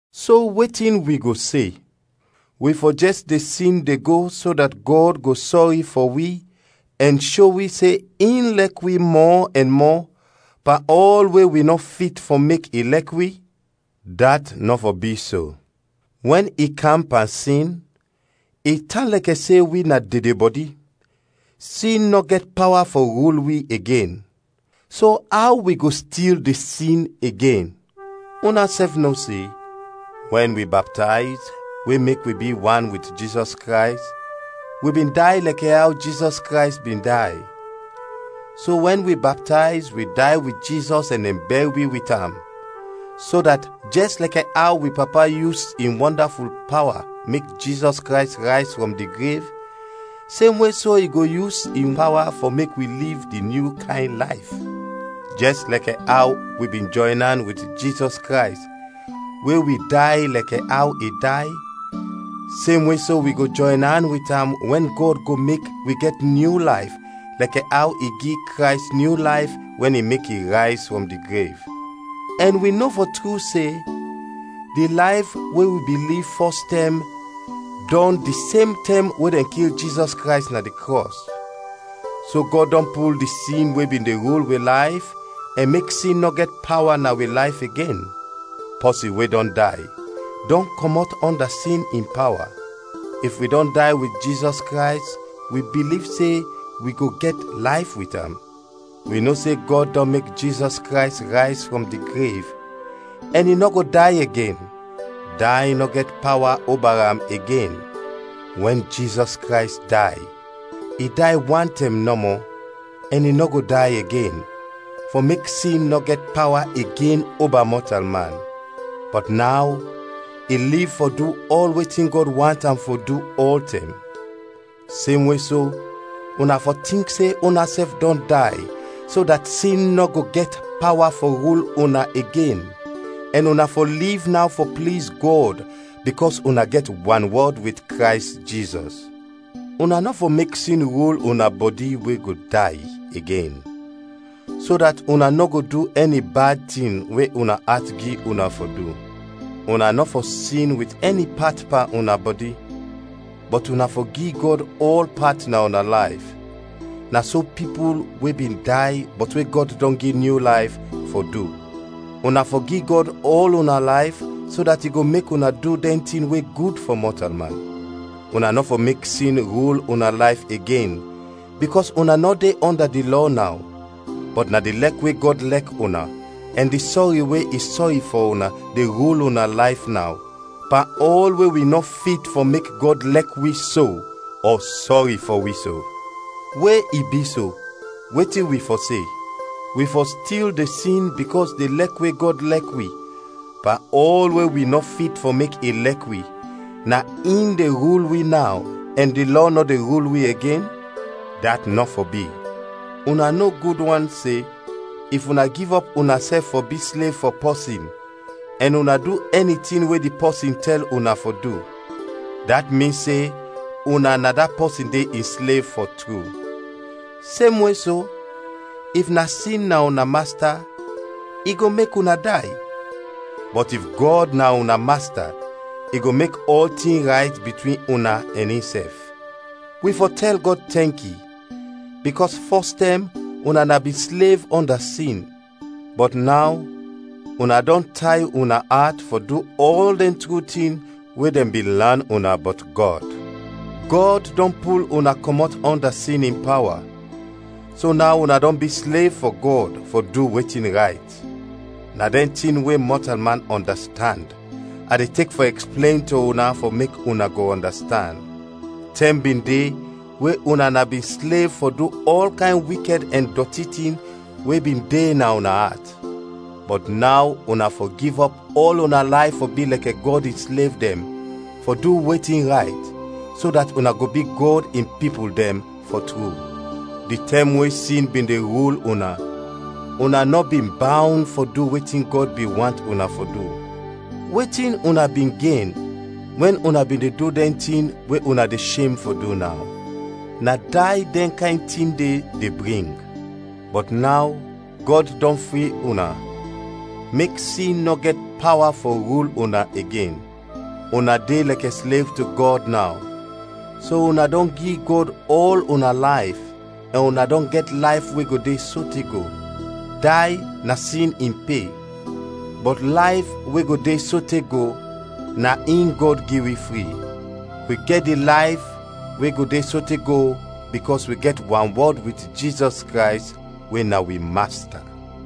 So wetin wi go se? Wi fɔ jɛs de sin de go so dat Gɔd go sɔri fɔ wi ɛn sho wi se in lɛk wi mɔ ɛn mɔ pan ɔl we wi nɔ fit fɔ mek i lɛk wi? Dat nɔ fɔ bi so! Wɛn i kam pan sin, i tan lɛkɛ se wi na dedebɔdi, sin nɔ gɛt pawa fɔ rul wi igen so aw wi go stil de sin igen? Unasɛf no se, wɛn wi baptayz we mek wi bi wan wit Jizɔs Krays, wi bin day lɛkɛ aw Jizɔs Krays bin day. So wɛn wi baptayz, wi day wit Jizɔs ɛn dɛn bɛr wi wit am, so dat jɛs lɛkɛ aw wi Papa yus in wɔndaful pawa mek Jizɔs Krays rayz frɔm di grev, semwe so i go yus in pawa fɔ mek wi liv di nyu kayn layf. Jɛs lɛkɛ aw wi bin jɔyn an wit Jizɔs Krays we wi day lɛkɛ aw i day, semwe so wi go jɔyn an wit am wɛn Gɔd go mek wi gɛt nyu layf lɛkɛ aw i gi Krays nyu layf wɛn i mek i rayz frɔm di grev. Ɛn wi no fɔ tru se, di layf we wi bin liv fɔs tɛm dɔn di sem tɛm we dɛn kil Jizɔs Krays na di krɔs, so Gɔd dɔn pul di sin we bin de rul wi layf ɛn mek sin nɔ gɛt pawa na wi layf igen. Pɔsin we dɔn day, dɔn kɔmɔt ɔnda sin in pawa. If wi dɔn day wit Jizɔs Krays wi biliv se wi go gɛt layf wit am. Wi no se Gɔd dɔn mek Jizɔs Krays rayz frɔm di grev, ɛn i nɔ go day igen; day nɔ gɛt pawa oba am igen. Wɛn Jizɔs Krays day, i day wan tɛm nɔmɔ, ɛn i nɔ go day igen, fɔ mek sin nɔ gɛt pawa igen oba mɔtalman. Bɔt naw i liv fɔ du ɔl wetin Gɔd want am fɔ du ɔltɛm. Semwe so, una fɔ tink se unasɛf dɔn day so dat sin nɔ go gɛt pawa fɔ rul una igen, ɛn una fɔ liv naw fɔ pliz Gɔd bikɔs una gɛt wanwɔd wit Krays Jizɔs. Una nɔ fɔ mek sin rul una bɔdi we go day, igen, so dat una nɔ go du ɛni bad tin we una at gi una fɔ du. Una nɔ fɔ sin wit ɛni pat pan una bɔdi, bɔt una fɔ gi Gɔd ɔl pat na una layf, na so pipul we bin day bɔt we Gɔd dɔn gi nyu layf, fɔ du; una fɔ gi Gɔd ɔl una layf so dat i go mek una du dɛn tin we gud fɔ mɔtalman. Una nɔ fɔ mek sin rul una layf igen, bikɔs una nɔ de ɔnda di lɔ naw, bɔt na di lɛk we Gɔd lɛk una ɛn di sɔri we i sɔri fɔ una de rul una layf naw, pan ɔl we wi nɔ fit fɔ mek Gɔd lɛk wi so ɔ sɔri fɔ wi so. We i bi so, wetin wi fɔ se? Wi fɔ stil de sin bikɔs di lɛk we Gɔd lɛk wi, pan ɔl we wi nɔ fit fɔ mek yu lɛk wi, na in de rul wi naw, ɛn di Lɔ nɔ de rul wi igen? Dat nɔ fɔ bi! Una no gud wan se, if una givɔp unasɛf fɔ bi slev fɔ pɔsin ɛn una du ɛni tin we di pɔsin tɛl una fɔ du, dat min se una na da pɔsin de in slev fɔ tru. Semwe so, if na sin na una masta, i go mek una day; bɔt if Gɔd na una masta, i go mek ɔltin rayt bitwin una ɛn insɛf. Wi fɔ tɛl Gɔd tɛnki, bikɔs fɔs tɛm una na bin slev ɔnda sin, bɔt naw una dɔn tay una at fɔ du ɔl dɛn tru tin we dɛn bin lan una bɔt Gɔd. Gɔd dɔn pul una kɔmɔt ɔnda sin in pawa, so naw una dɔn bi slev fɔ Gɔd fɔ du wetin rayt. Na dɛn tin we mɔtalman ɔndastand, a de tek fɔ ɛksplen to una fɔ mek una go ɔndastand. Tɛm bin de we una na bin slev fɔ du ɔl kayn wikɛd ɛn dɔti tin we bin de na una at. Bɔt naw una fɔ givɔp ɔl una layf fɔ bi lɛkɛ Gɔd in slev dɛn fɔ du wetin rayt, so dat una go bi Gɔd in pipul dɛn, fɔ tru. Di tɛm we sin bin de rul una, una nɔ bin bawn fɔ du wetin Gɔd bin want una fɔ du. Wetin una bin gen wɛn una bin de du dɛn tin we una de shem fɔ du naw? Na day dɛn kayn tin de, de bring. Bɔt naw Gɔd dɔn fri una, mek sin nɔ gɛt pawa fɔ rul una igen; una de lɛkɛ slev to Gɔd naw, so una dɔn gi Gɔd ɔl una layf ɛn una dɔn gɛt layf we go de sote go. Day na sin in pe, bɔt layf we go de sote go, na in Gɔd gi wi fri. Wi gɛt di layf we go de sote go bikɔs wi gɛt wanwɔd wit Jizɔs Krays we na wi Masta.